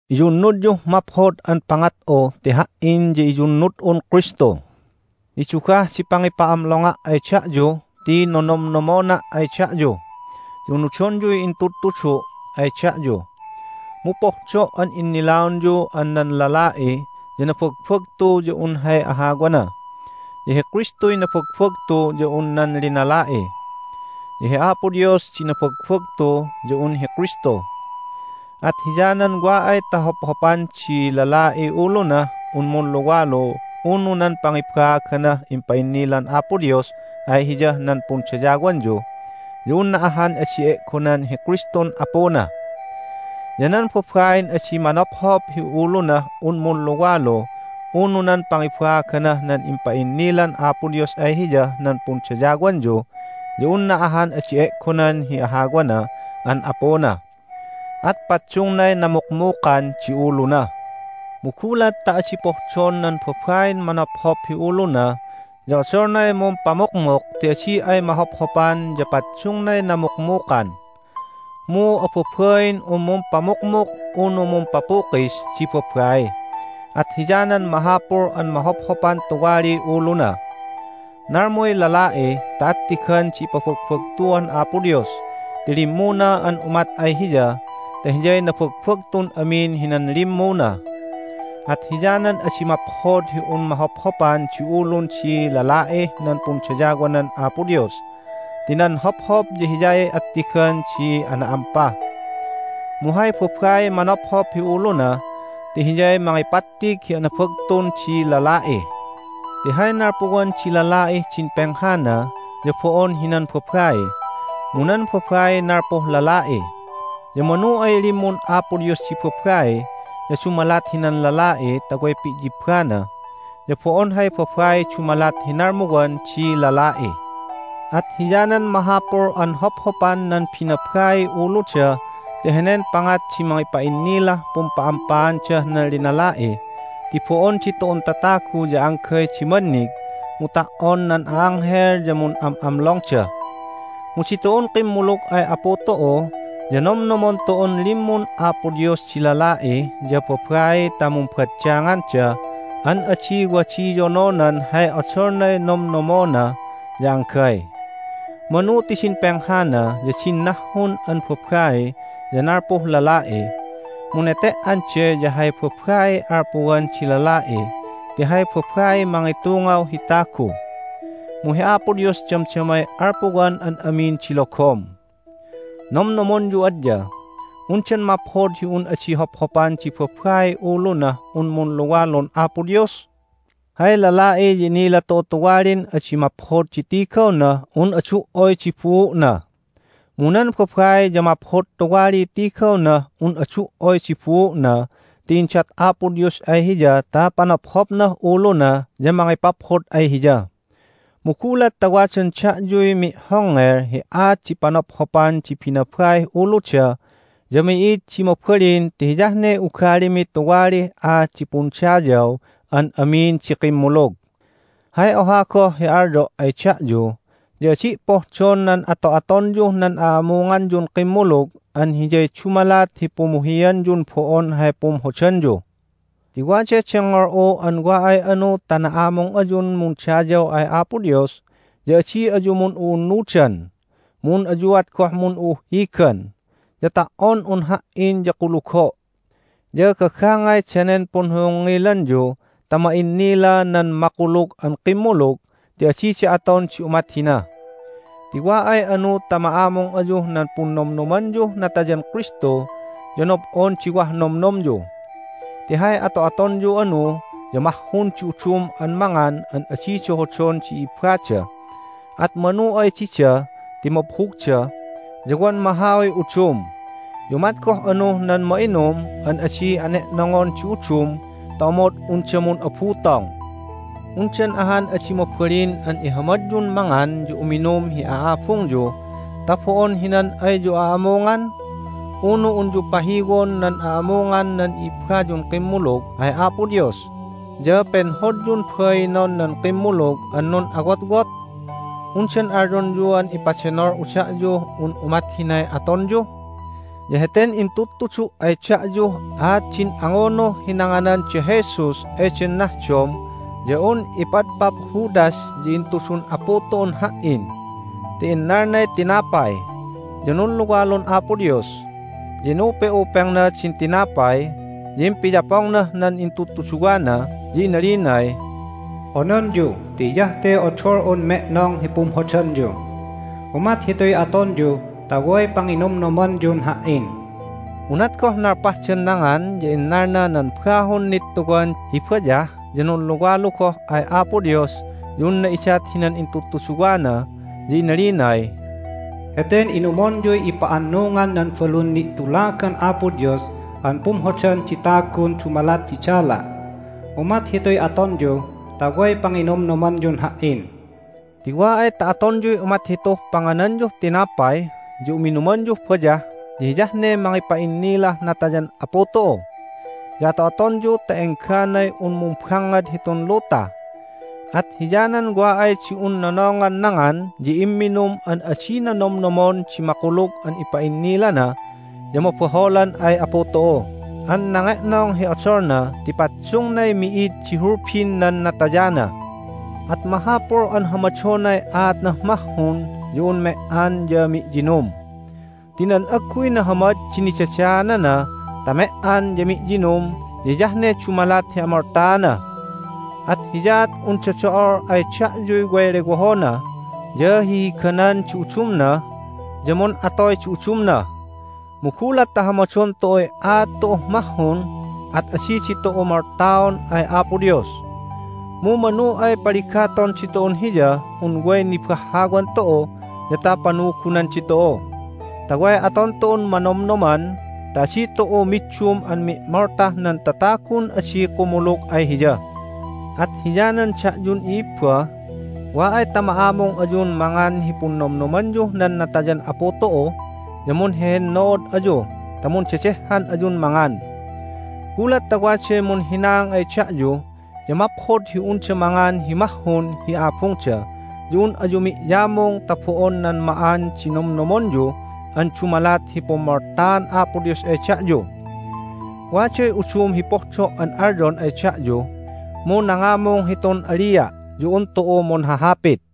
Iyunnudyuh maphod an pangat'u ti ha"in ya iyunnud'un Kristu. Nidugah di pangipa'amlonga' ay da'yu ti nonomnomona' ay da'yu, ya unudonyuy intudtudu' ay da'yu. Mu pohdo' an innilaonyu an nan lala'i ya nabagbagtu ya un hay ahawana, ya hi Kristuy nabagbagtu ya un nan linala'i, ya hi Apo Dios di nabagbagtu ya un hi Kristu. At hiyanan wa ay ta hophopan di lala'iy ulunah un munluwalu unu nan pangibaaganah impa'innilan Apo Dios ay hiyah nan pundayawanyu ya unna ahan adi e'gonan hi Kristun Apuna. Ya nan babain adi manophop hi ulunah un munluwalu unu nan pangibaaganah nan impa'innilan Apo Dios ay hiyah nan pundayawanyu ya unna ahan adi e'gonan hi ahawana an apuna. At paddungnay namukmukan di uluna. Mu gulat ta adi pohdon nan babain manophop hi uluna ya odolnay mumpamukmuk ti adi ay mahophopan ya paddungnay namukmukan. Mu ababain un mumpamukmuk unu mumpapukis di babai, at hiyanan mahapul an mahophopan tuwaliy uluna. Nalmuy lala'i ta attigan di ipabagbagtuan Apo Dios ti limmuna an umat ay Hiya ta hiyay nabagbagtun amin hinan limmuna. At hiyanan adi maphod hi un mahophopan di ulun di lala'ih nan pundayawanan Apo Dios ti nan hophop ya hiyay attigan di ana'ampa. Mu hay babaiy manophop hi uluna ti hiyay mangipattig hi anabagtun di lala'i. Ti hay nalpuwan di lala'ih din penghana ya bo'on hinan babai, mu nan babaiy nalpuh lala'i. Ya manu ay limmun Apo Dios di babai ya dumalat hinan lala'i ta way pi'yibbana, ya bo'on hay babaiy dumalat hi nalmuwan di lala'i. At hiyanan mahapul an hophopan nan binabaiy uluda ti henen pangat di mangipa'innilah pumpa'ampaandah nan linala'i, ti bo'on ditu'un tatagu ya anggay di mannig, mu ta"on nan a'anghel ya mun'am'amlongda. Mu ditu'un kimmulug ay Apu tu'u ya nomnomon tu'un limmun Apo Dios di lala'i ya babai ta mumbaddanganda an adi wadiyononan hay odolnay nomnomnomona ya anggay. Manu ti din penghana ya din nahhun an babai ya nalpuh lala'i, mu nete"an de ya hay babaiy alpuwan di lala'i ti hay babaiy mangitungaw hi tagu. Mu hi Apo Dios damdamay alpuwan an amin di logom. Nomnomonyu adya: Undan maphod hi un adi hophopan di babaiy ulunah un munluwalun Apo Dios? Hay lala'i ya inila tu'u tuwalin adi maphod di tigawnah un adu"oy di buu'na. Mu nan babai ya maphod tuwaliy tigawnah un adu"oy di buu'na ti indat Apo Dios ay hiya ta panophopnah uluna ya mangipaphod ay hiya. Mu gulat ta wadan da'yuy mi'hongngel hi aat di panophopan di binabaih uluda ya mi'id di mabalin ti hiyah ne ugalimi tuwalih aat di pundayaw an amin di kimmulug. Hay oha goh hi alyo' ay da'yu ya adi' pohdon nan ato'atonyuh nan a'amunganyun kimmulug an hiyay dumalat hi pumuhianyun bo'on hay pumhodanyu. Ti waday dengngol'u an wa ay anu ta na'amung ayun mundayaw ay Apo Dios ya adi ayu mun'u'unnudan, mu un ayuat goh mun'u'uhhigan, ya ta"on un ha"in ya kulugo'. Ya gagangay danen punhohongngilanyu ta ma'innila nan makulug an kimmulug ti adida aton di umat hina. Ti wa ay anu ta ma'amung ayuh nan Punnomnomanyuh Natayan Kristu ya nob'on di wah nomnomyu. Ti hay ato'atonyu anu ya mahhun di udum an mangan an adida hodon di i'ibbada, at manu ay dida ti mabhugda, ya wan mahauy udum. Ya umat goh anuh nan ma'inum an adi ane'nongon di udum ta omod unda mun'abutong. Undan ahan adi mabalin an ihamadyun mangan ya uminum hi a'abungyu ta bo'on hinan ayyu a'amungan? Unu unyu pahiwon nan a'amungan nan i'ibbayun kimmulug ay Apo Dios, ya penhodyun bainon nan kimmulug an nun'awotwot? Undan alyonyuan ipadenol'u da'yuh un umat hinay atonyu? Ya heten intudtudu' ay da'yuh aat din angunuh hi nanganan da Jesus eden nahdom ya un ipadpap Judas ya intudun Apu tu'un ha"in. Ti innalnay tinapay, ya nunluwalun Apo Dios. Ya inupe'upengna din tinapay, ya impiyapongnah nan intudtuduwana, ya inalinay, "Ononyu ti hiyah te odol'un me'nong hi pumhodanyu. Umat hituy atonyu ta way panginomnomanyun Ha"in." Unat goh nalpahdan nangan ya innalna nan bahun nittuwan hi bayah, ya nunluwalu goh ay Apo Dios ya unna idat hinan intudtuduwana. Ya inalinay, "Heten inumonyuy ipa'annungan nan balun ni'tulagan Apo Dios an pumhodan di tagun dumalat di dala'. Umat hituy atonyu ta way panginomnomanyun Ha"in." Ti wa ay ta atonyuy umat hituh pangananyuh tinapay ya uminumanyuh bayah ya hiyah ne mangipa'innilah natayan Apu tu'u, ya ato'atonyu ta engganay un mumbangngad hitun luta. At hiyanan wa ay di un nonongan nangan ya imminum an adina nomnomon di makulug an ipa'innilana ya mabaholan ay Apu tu'u an nange'nong hi odolna ti paddungnay mi'id di hulbin nan natayana. At mahapul an hamadonay aatnah mahhun ya un me"an ya mi'yinum. Ti nan agguy nahamad di nidadaanana ta me"an ya mi'yinum ya hiyah ne dumalat hi amoltaana. At hiyaat unda do'ol ay da'yuy way lewohona, ya hihiganan di udumna, ya mun'atoy di udumna. Mu gulat ta hamadon tu'uy aat tu'uh mahhun at adi ditu'u moltaon ay Apo Dios. Mu manu ay paligaton ditu'un Hiyah un way nibahhawan tu'u ya ta panugunan ditu'u, ta way aton tu'un manomnoman, ta adi tu'u middum an mi'moltah nan tatagun adi kumulug ay Hiya. At hiyanan da'yun i'ibba, wa ay ta ma'amung ayun mangan hi Punnomnomanyuh nan Natayan Apu tu'u ya munhehennood ayu ta mundedehhan ayun mangan. Gulat ta waday munhinaang ay da'yu ya maphod hi unda mangan hi mahhun hi abungda ya un ayu mi'yamung ta bo'on nan ma'an di nomnomonyu an dumalat hi pummoltaan Apo Dios ay da'yu. Waday udum hi pohdo' an alyon ay da'yu, mu nangamung hitun alia' ya un tu'u munhahapit.